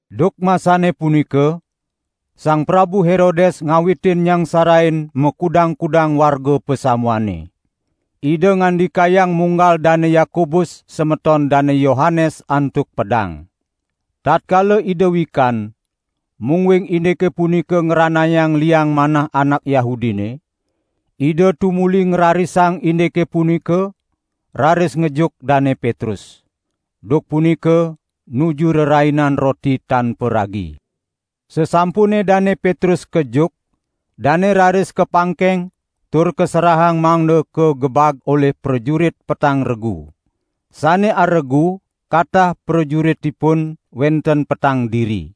Duk masane punika Sang Prabu Herodes ngawitin nyangsarain makudang-kudang warga pasamuane. Ida ngandikayang munggal Dane Yakobus semeton Dane Yohanes antuk pedang. Tatkala ida wikan, mungguing indike punika ngranayang liang manah anak Yahudine, ida tumuli ngrarisang indike punika, raris ngejuk Dane Petrus. (Duk punika nuju Rerainan Roti Tan Paragi.) Sasampune Dane Petrus kejuk, dane raris kapangkeng tur kaserahang mangda kagebag olih prajurit petang regu. Sane aregu, katah prajuritipun wenten petang diri.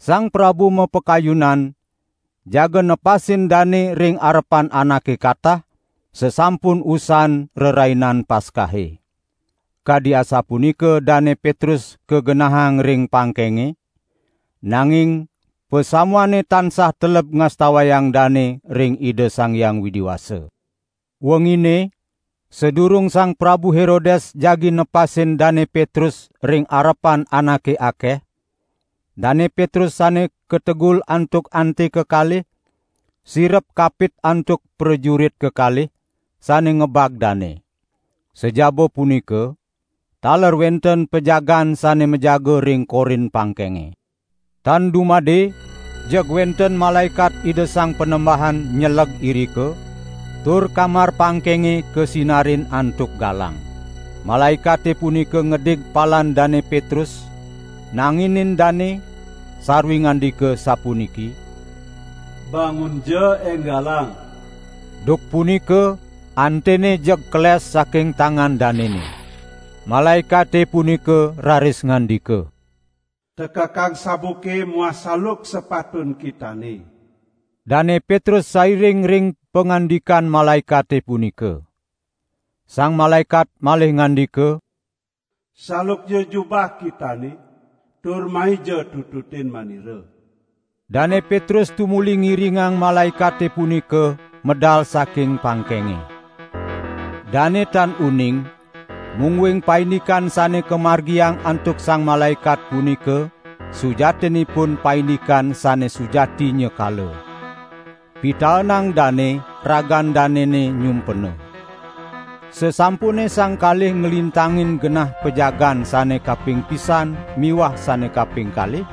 Sang prabu mapakayunan jaga nepasin dane ring arepan anake katah, sasampun usan Rerainan Paskahe. Kadi asapunika Dane Petrus kagenahang ring pangkenge, nanging pasamuane tansah teleb ngastawayang dane ring Ida Sang Hyang Widi Wasa. Wengine, sadurung Sang Prabu Herodes jagi nepasin Dane Petrus ring arepan anake akeh, Dane Petrus sane kategul antuk ante kekalih, sirep kapit antuk prajurit kekalih, sane ngebag dane. Sajaba punika, taler wenten pajagaan sane majaga ring korin pangkenge. Tan dumade jeg wenten malaekat Ida Sang Panembahan nyeleg irika, tur kamar pangkenge kasinarin antuk galang. Malaekate punika ngedig palan Dane Petrus, nanginin dane, sarwi ngandika sapuniki: "Bangunja enggalang!" Duk punika antene jeg keles saking tangan danene. Malaekate punika raris ngandika: "Tekekang sabuke muah saluk sepatun kitane." Dane Petrus sairing ring pangandikan malaekate punika. Sang malaekat malih ngandika: "Salukja jubah kitane, tur maija tututin manira." Dane Petrus tumuli ngiringang malaekate punika medal saking pangkenge. Dane tan uning mungguing paindikan sane kamargiang antuk sang malaekat punika sujatinipun paindikan sane sujati nyekala. Pitaenang dane ragan danene nyumpena. Sasampune sang kalih nglintangin genah pajagaan sane kaping pisan miwah sane kaping kalih,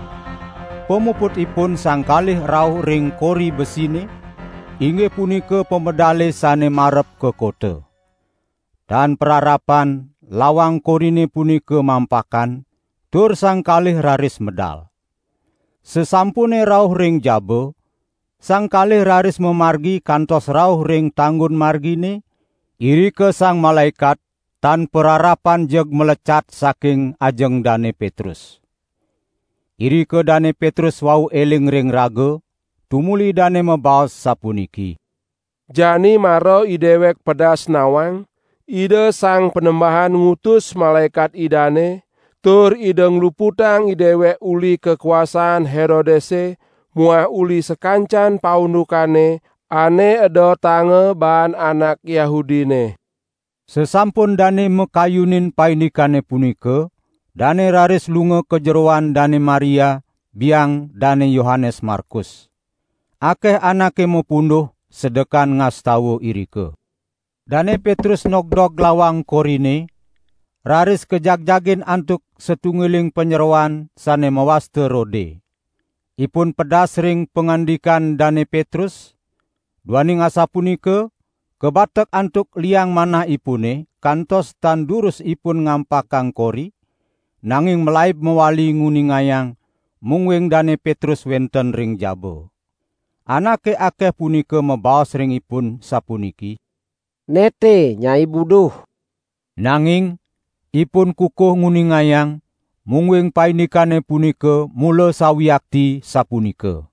pamuputipun sang kalih rauh ring kori besine, inggih punika pamedale sane marep ka kota. Tan pararapan lawang korine punika mampakan, tur sang kalih raris medal. Sasampune rauh ring jaba, sang kalih raris mamargi kantos rauh ring tanggun margine, irika sang malaekat tan pararapan jeg malecat saking ajeng Dane Petrus. Irika Dane Petrus wau eling ring raga, tumuli dane mabaos sapuniki: "Jani mara idewek pedas nawang, Ida Sang Panembahan ngutus malaekat Idane, tur Ida ngluputang idewek uli kakuasan Herodese muah uli sakancan paundukane ane edotanga baan anak Yahudine." Sasampun dane makayunin paindikane punika, dane raris lunga ka jeroan Dane Maria, biang Dane Yohanes Markus. Akeh anake mapunduh sedekan ngastawa irika. Dane Petrus nogdog lawang korine, raris kajagjagin antuk satunggiling panyeroan sane mawasta Rode. Ipun pedas ring pangandikan Dane Petrus, duaning asapunika kabatek antuk liang manahipune kantos tan durus ipun ngampakang kori, nanging malaib mawali nguningayang, mungguing Dane Petrus wenten ring jaba. Anake akeh punika mabaos ring ipun sapuniki: "Ne te nyai buduh!" Nanging ipun kukuh nguningayang, mungguing paindikane punika mula sawiakti sapunika.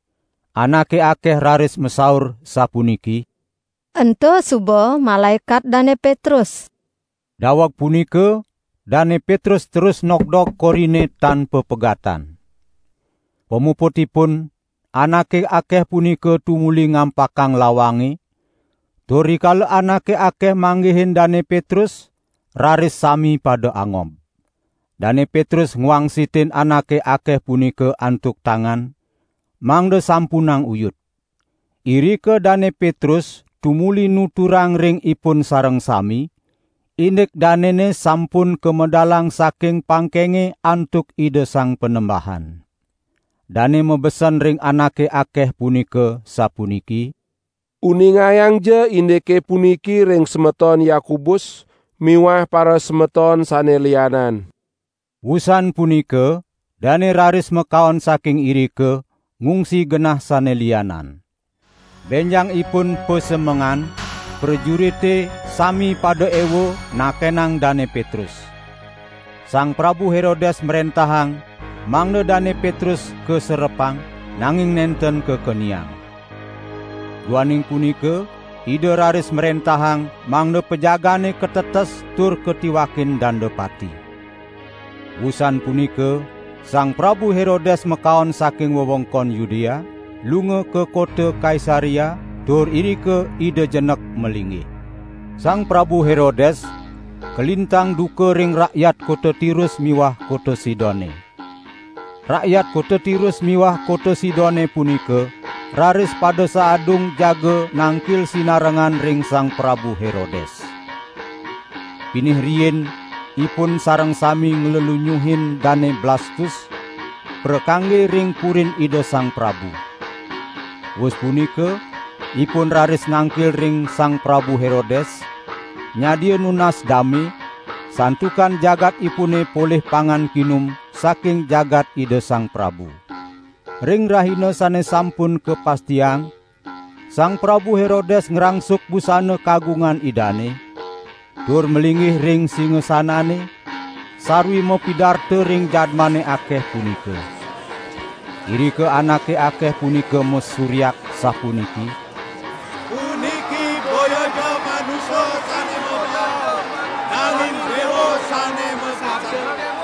Anake akeh raris masaur sapuniki: "Ento suba malaekat Dane Petrus." Daweg punika Dane Petrus terus nogdog korine tan papegatan. Pamuputipun anake akeh punika tumuli ngampakang lawange, tur rikala anake akeh manggihin Dane Petrus, raris sami pada angob. Dane Petrus ngwangsitin anake akeh punika antuk tangan, mangda sampunang uyut. Irika Dane Petrus tumuli nuturang ring ipun sareng sami, indik danene sampun kamedalang saking pangkenge antuk Ida Sang Panembahan. Dane mabesen ring anake akeh punika, sapuniki: "Uningayangja indike puniki ring semeton Yakobus miwah parasemeton sane lianan." Wusan punika dane raris makaon saking irika, ngungsi genah sane lianan. Benjangipun pasemengan, prajurite sami pada ewa, nakenang Dane Petrus. Sang Prabu Herodes mrentahang mangda Dane Petrus kaserepang, nanging nenten kakeniang. Duaning punika ida raris mrentahang mangda pajagaane katetes tur katiwakin danda pati. Wusan punika Sang Prabu Herodes makaon saking wewengkon Yudea, lunga ka kota Kaisarea tur irika ida jenek malinggih. Sang Prabu Herodes kalintang duka ring rakyat kota Tirus miwah kota Sidone. Rakyat kota Tirus miwah kota Sidone punika raris pada saadung jaga nangkil sinarengan ring Sang Prabu Herodes. Pinih riin ipun sareng sami nglelunyuhin Dane Blastus, prakangge ring purin ida sang prabu. Wus punika ipun raris nangkil ring Sang Prabu Herodes, nyadia nunas dame, santukan jagatipune polih pangan kinum saking jagat ida sang prabu. Ring rahina sane sampun kapastiang, Sang Prabu Herodes ngrangsuk busana kagungan idane, tur malinggih ring singasanane, sarwi mapidarta ring jadmane akeh punika. Irika anake akeh punika masuryak sapuniki: "Puniki boyaja manusa sane mabaos, nanging dewa sane masabda!"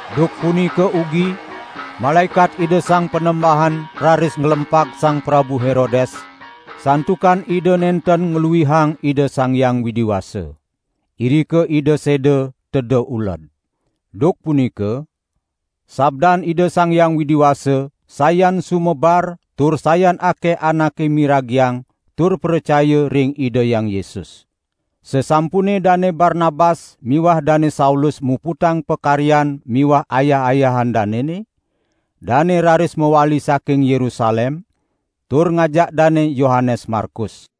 Duk punika ugi malaekat Ida Sang Panembahan raris nglempag Sang Prabu Herodes santukan ida nenten ngluihang Ida Sang Hyang Widi Wasa. Irika ida seda teda uled. Duk punika sabdan Ida Sang Hyang Widi Wasa sayan sumebar tur sayan akeh anake miragiang tur pracaya ring Ida Hyang Yesus. Sasampune Dane Barnabas miwah Dane Saulus muputang pakaryan miwah ayah-ayahan danene, dane raris mawali saking Yerusalem, tur ngajak Dane Yohanes Markus.